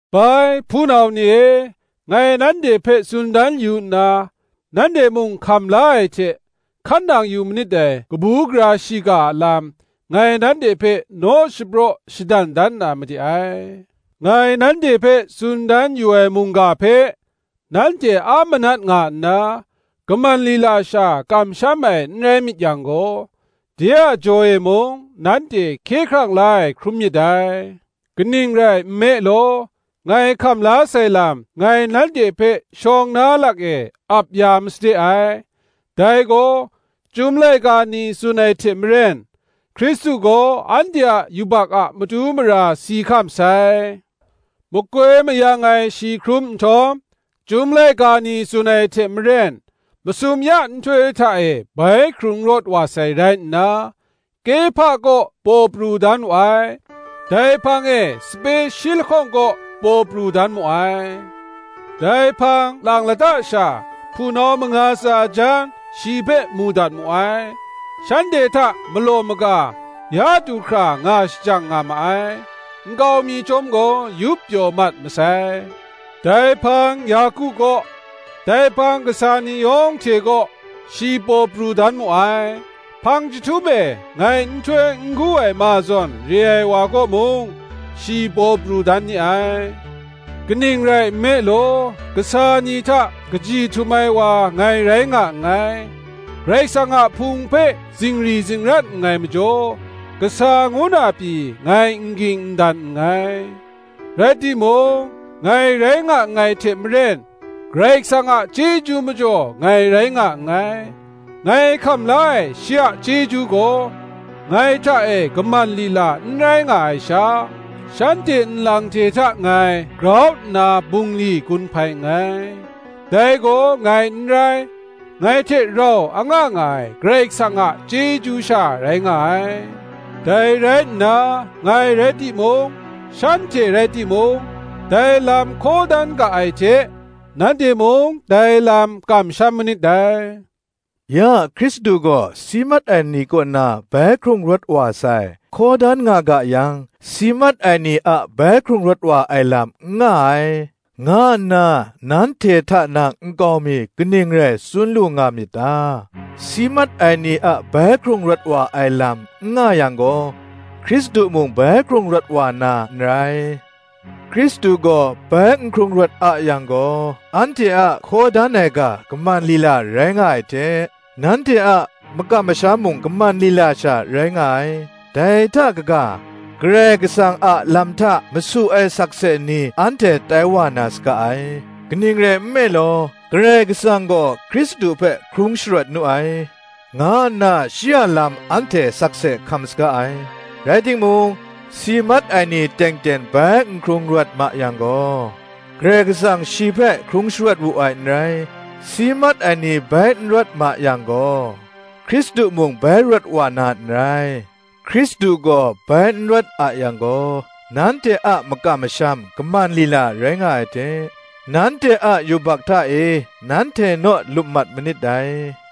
Bai hpunau ni e, ngai nanhte hpe tsun dan yu nna, nanhte mung hkam la ai hte, hkan nang yu manit dai kabu gara shiga a lam, ngai nanhte hpe naw shapraw shadan dan na made ai; ngai nanhte hpe tsun dan yu ai mungga hpe nanhte a manat nga nna, kaman lila sha kamsham ai n rai myit yang gaw, de a jaw e mung nanhte hkye hkrang la ai hkrum myit dai. Kaning rai nme law, ngai hkam la sai lam ngai nanhte hpe shawng na lak e ap ya masade ai; dai gaw, Chyum laika ni tsun ai hte maren, Hkristu gaw anhte a yubak a matu mara si hkam sai; makoi mayang ai shi hkrum nhtawm, Chyum laika ni tsun ai hte maren, masum ya nhtoi hta e bai hkrung rawt wa sai rai nna, Kehpa kaw paw pru dan wu ai; dai hpang e sape shi lahkawng kaw paw pru dan mu ai; dai hpang lang lata sha hpunau manga tsa jan shi hpe mu dat mu ai: shanhte hta malaw maga ya du hkra nga shajang nga ma ai; nkau mi chyawm gaw yup pyaw mat masai; dai hpang Yaku kaw, dai hpang kasa ni yawng hte kaw, shi paw pru dan mu ai; hpang chyahtum e, ngai nhtoi n gu ai ma zawn re ai wa kaw mung, shi paw pru dan ni ai. Kaning rai nme law, kasa ni hta kaji htum ai wa ngai rai nga nngai; Karai Kasang a Hpung hpe zingri zingrat nngai majaw, kasa ngu na pyi ngai n ging n dan nngai. Rai timung, ngai rai nga nngai hte maren, Karai Kasang a chyeju majaw ngai rai nga nngai; ngai hkam la ai shi a chyeju gaw, ngai hta e kaman lila n rai nga ai sha, shanhte nlang hte hta ngai grau nna bungli gun hpai nngai; dai gaw ngai n rai, ngai hte rau anga nga ai Karai Kasang a chyeju sha rai nga ai. Dai rai nna, ngai rai timung, shanhte rai timung, dai lam hkaw dan ga ai hte, nanhte mung dai lam kamsham manit dai. Ya Hkristu gaw si mat ai ni kaw na bai hkrung rawt wa sai, hkaw dan nga ga yang, si mat ai ni a bai hkrung rawt wa ai lam n nga ai, nga nna nanhte hta na nkau mi kaning rai tsun lu nga myit ta? Si mat ai ni a bai hkrung rawt wa ai lam n nga yang gaw, Hkristu mung bai hkrung rawt wa na n rai. Hkristu gaw bai n hkrung rawt a yang gaw, anhte a hkaw dan ai ga kaman lila rai nga ai hte, nanhte a makam masham mung kaman lila sha rai nga ai; dai hta kaga, Karai Kasang a lam hta masu ai sakse ni anhte tai wa na saga ai; kaning rai nme law, Karai Kasang gaw Hkristu hpe hkrung sharawt nu ai, nga nna shi a lam anhte sakse hkam saga ai; rai timung, si mat ai ni teng teng bai n hkrung rawt ma yang gaw, Karai Kasang shi hpe hkrung sharawt wu ai n rai. Si mat ai ni bai n rawt ma yang gaw, Hkristu mung bai rawt wa na n rai. Hkristu gaw bai n rawt a yang gaw, nanhte a makam masham kaman lila rai nga ai hte, nanhte a yubak hta e nanhte naw lup mat manit dai.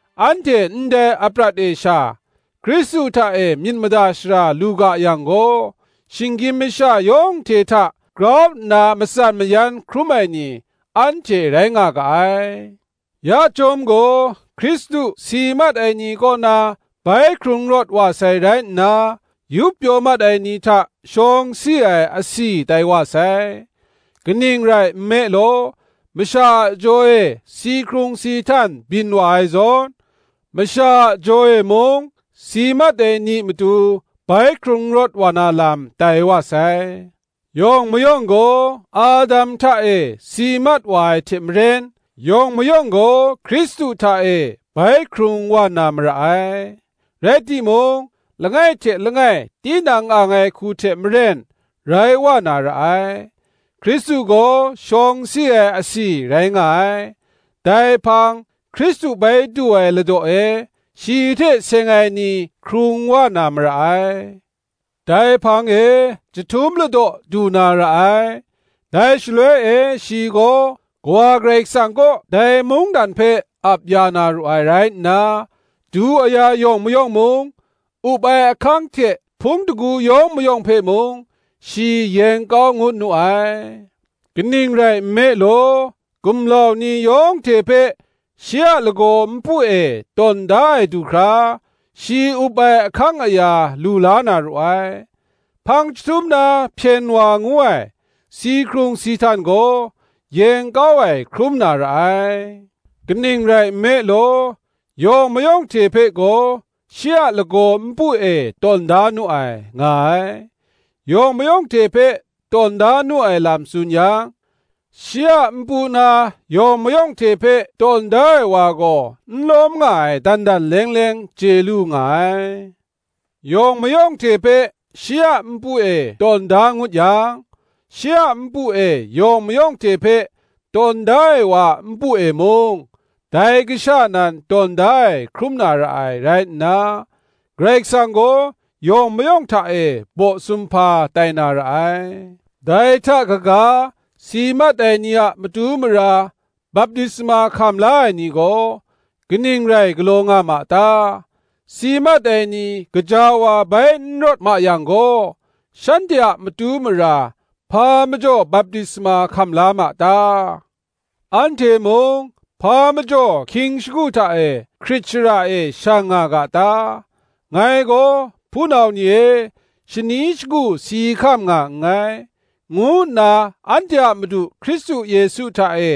Anhte ndai aprat e sha Hkristu hta e myit mada shara lu ga yang gaw, shinggyim masha yawng hte hta grau nna matsan mayan hkrum ai ni, anhte rai nga ga ai. Ya chyawm gaw, Hkristu si mat ai ni kaw na bai hkrung rawt wa sai rai nna, yup pyaw mat ai ni hta shawng si ai asi tai wa sai. Kaning rai nme law, masha a jaw e si hkrung si htan byin wa ai zawn, masha a jaw e mung si mat ai ni matu bai hkrung rawt wa na lam tai wa sai. Yawng mayawng gaw Adam hta e si mat wa ai hte maren, yawng mayawng gaw Hkristu hta e bai hkrung wa na mara ai. Rai timung, langai hte langai tinang ang ai hku hte maren rai wa na ra ai: Hkristu gaw shawng si ai asi rai nga ai; dai hpang, Hkristu bai du ai ladaw e shi hte seng ai ni hkrung wa na mara ai; dai hpang e chyahtum ladaw du na ra ai; dai shaloi e shi gaw Kawa Karai Kasang kaw dai mungdan hpe ap ya na ru ai rai nna, du aya yawng mayawng mung, up ai ahkang hte hpung shingkang yawng mayawng hpe mung, shi yeng kau ngut nu ai: kaning rai nme law, gumlau ni yawng hte hpe shi a lagaw npu e tawn da ai du hkra, shi up ai ahkang aya lu la na ru ai. Hpang chyahtum na hpyen wa ngu ai, si hkrung si htan gaw, yeng kau ai hkrum na ra ai. Kaning rai nme law, yawng mayawng hte hpe gaw shi a lagaw npu e tawn da nu ai, nga ai. Yawng mayawng hte hpe tawn da nu ai lam tsun yang, shi a npu na yawng mayawng hte hpe tawn da ai wa gaw n lawm nga ai, dan dan leng leng chye lu nga ai. Yawng mayawng hte hpe shi a npu e tawn da ngut yang, shi a npu e yawng mayawng hte hpe tawn da ai wa a npu e mung, dai Kasha nan tawn da ai hkrum na ra ai rai nna, Karai Kasang gaw yawng mayawng hta e baw sumhpa tai na ra ai. Dai hta kaga, si mat ai ni a matu mara baptisma hkam la ai ni gaw, kaning rai galaw nga ma ta? Si mat ai ni gaja wa bai n rawt ma yang gaw, shanhte a matu mara hpa majaw baptisma hkam la ma ta? Anhte mung hpa majaw hkying shagu hta e hkrit shara e shang nga ga ta? Ngai gaw, hpunau ni e, shani shagu si hkam nga nngai, ngu nna anhte a Madu Hkristu Yesu hta e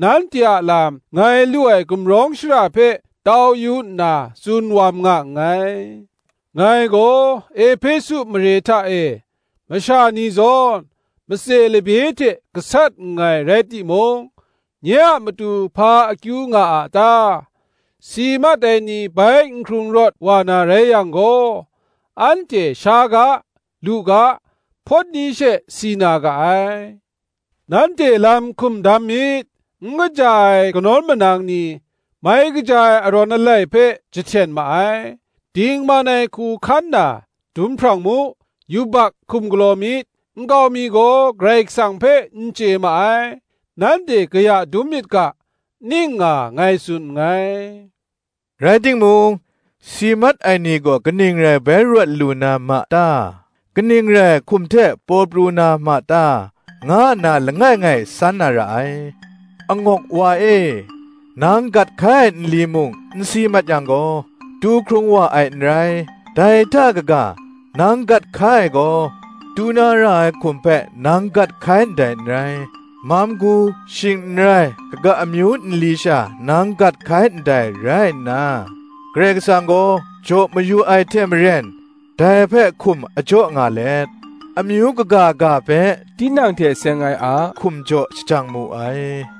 nanhte a lam ngai lu ai gumrawng shara hpe tau yu nna tsun wam nga nngai. Ngai gaw Ehpesu mare hta e masha ni zawn, matse labye hte gasat nngai rai timung, nye a matu hpa akyu nga a ta? Si mat ai ni bai n hkrung rawt wa na rai yang gaw, anhte sha ga, lu ga, hpawt ni she si na ga ai. Nanhte lam hkum dam myit; N kaja ai kanawn manang ni, mai kaja ai arawn alai hpe jahten ma ai. Dingman ai hku hkan na, dum hprang mu, yubak hkum galaw myit; nkau mi gaw Karai Kasang hpe n chye ma ai: nanhte kaya dum myit ga, ning nga ngai tsun nngai. Rai timung, si mat ai ni gaw kaning rai bai rawt lu na ma ta? kaning re ai hkum hte paw pru na ma ta? nga nna langai ngai san na ra ai. Angawk wa e, nang gat hkai ai nli mung n si mat yang gaw, tu hkrung wa ai n rai; dai hta kaga, nang gat hkai ai gaw, tu na ra ai hkum hpe nang gat hkai ndai n rai; mam gu shing n rai kaga amyu nli sha nang gat hkai ndai rai nna, Karai Kasang gaw jaw mayu ai hte maren, dai hpe hkum a jaw nga let, amyu kaga ga hpe tinang hte seng ai ahkum jaw shajang mu ai.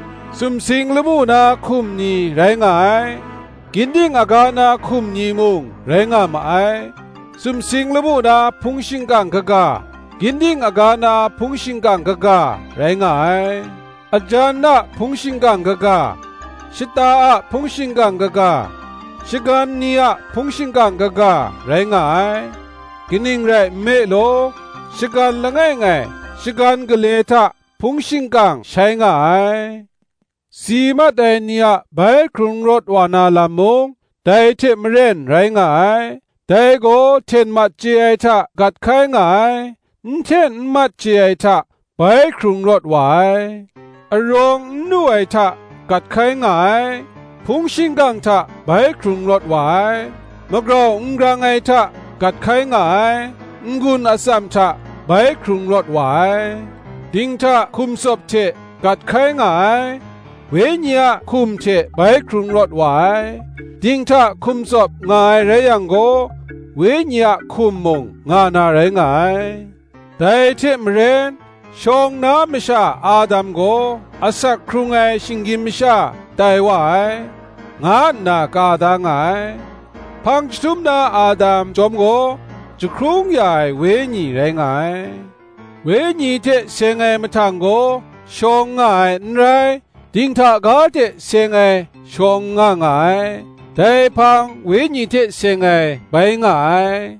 Sumsing lamu na hkum ni rai nga ai, ginding aga na hkum ni mung rai nga ma ai: sumsing lamu na hpung shingkang kaga, ginding aga na hpung shingkang kaga, rai nga ai. Ajan a hpung shingkang kaga, shata a hpung shingkang kaga, shagan ni a hpung shingkang kaga, rai nga ai; kaning rai nme law, shagan langai ngai shagan gale hta hpung shingkang shai nga ai. Si mat ai ni a bai hkrung rawt wa na lam mung, dai hte maren rai nga ai. Dai gaw hten mat chye ai hta gat hkai nga ai, n hten n mat chye ai hta bai hkrung rawt wa ai; arawng n lu ai hta gat hkai nga ai, hpung shingkang hta bai hkrung rawt wa ai; magrau n grang ai hta gat hkai nga ai, n-gun atsam hta bai hkrung rawt wa ai; dinghta hkum tsawp hte gat hkai nga ai, wenyi a hkum hte bai hkrung rawt wa ai. Dinghta hkum tsawp nga ai rai yang gaw, wenyi a hkum mung nga na rai nga ai. Dai hte maren, shawng na masha Adam gaw asak hkrung ai shinggyim masha tai wa ai, nga nna ka da nga ai: hpang chyahtum na Adam, chyawm gaw, jahkrung ya ai wenyi rai nga ai. Wenyi hte seng ai mahtang gaw shawng nga ai n rai, dinghta ga hte seng ai shawng nga nga ai; dai hpang wenyi hte seng ai bai nga ai.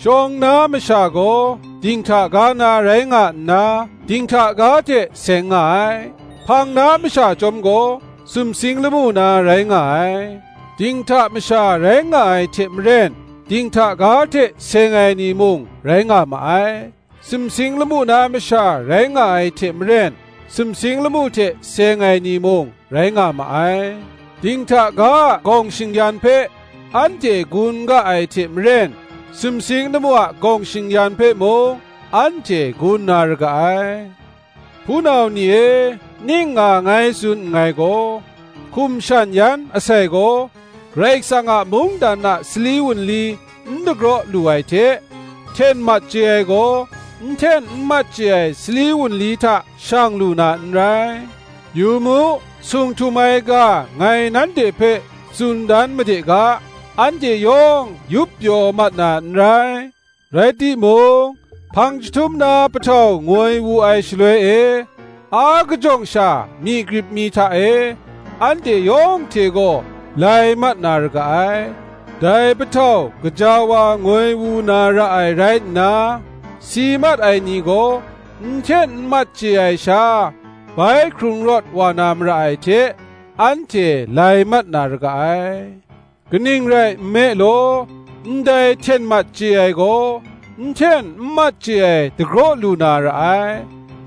Shawng na masha gaw dinghta ga na rai nga nna, dinghta ga hte seng nga ai: hpang na masha chyawm gaw, sumsing lamu na rai nga ai. Dinghta masha rai nga ai hte maren, dinghta ga hte seng ai ni mung rai nga ma ai; sumsing lamu na masha rai nga ai hte maren, sumsing lamu hte seng ai ni mung, rai nga ma ai. Dinghta ga a gawng shing-yan hpe anhte gun ga ai hte maren, sumsing lamu a gawng shing-yan hpe mung, anhte gun na ra ga ai. Hpunau ni e, ning nga ngai tsun nngai gaw, hkum shan yan asai gaw Karai Kasang a mungdan a sali wunli n dagraw lu ai hte, hten mat chye ai gaw, n hten n mat chye ai sali wunli hta shang lu na n rai. Yu mu, sung htum ai ga ngai nanhte hpe tsun dan made ga: anhte yawng yup pyaw mat na n rai; rai timung, hpang chyahtum na pahtau ngoi wu ai shaloi e, akajawng sha, myi grip mi hta e, anhte yawng hte gaw lai mat na ra ga ai: dai pahtau gaja wa ngoi wu na ra ai rai nna, si mat ai ni gaw n hten n mat chye ai sha bai hkrung rawt wa na mara ai hte, anhte lai mat na ra ga ai. Kaning rai nme law, ndai hten mat chye ai gaw, n hten n mat chye ai dagraw lu na ra ai;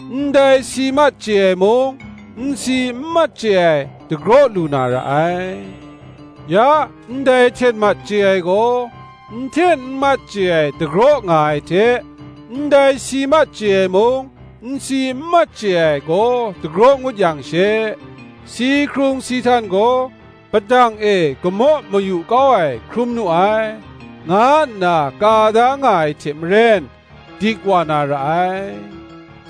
ndai si mat chye ai mung, n si n mat chye ai, dagraw lu na ra ai. Ya ndai hten mat chye ai gaw, n hten n mat chye ai dagraw nga ai hte, ndai si mat chye ai mung, n si n mat chye ai gaw dagraw ngut yang she, Si hkrung si htan gaw padang e gamaw mayu kau ai hkrum nu ai, nga nna ka da nga ai hte maren, dik wa na ra ai.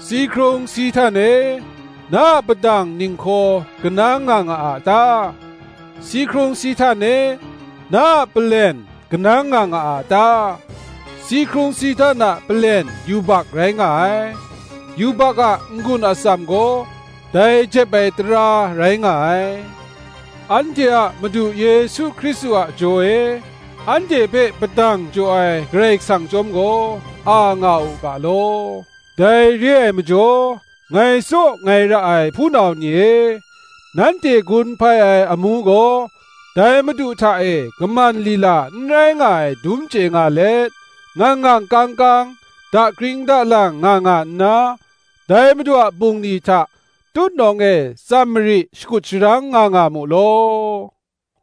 Si hkrung si htan e, na a padang ninghkaw kanang nga nga a ta? Si hkrung si htan e, na a palen kanang nga nga a ta? Si hkrung si htan a palen yubak rai nga ai; yubak a n-gun atsam gaw, dai jep ai tara rai nga ai. Anhte a Madu Yesu Hkristu a jaw e anhte hpe padang jaw ai Karai Kasang chyawm gaw, a nga u ga law. Dai re ai majaw ngai tsaw ngai ra ai hpunau e, nanhte gun hpai ai amu gaw dai Madu hta e kaman lila n rai nga ai dum chye nga let, ngang ngang kang kang, dakring dalang nga nga nna, dai Madu a bungli hta tutnawng e tsam mari shakut sharang nga nga mu law.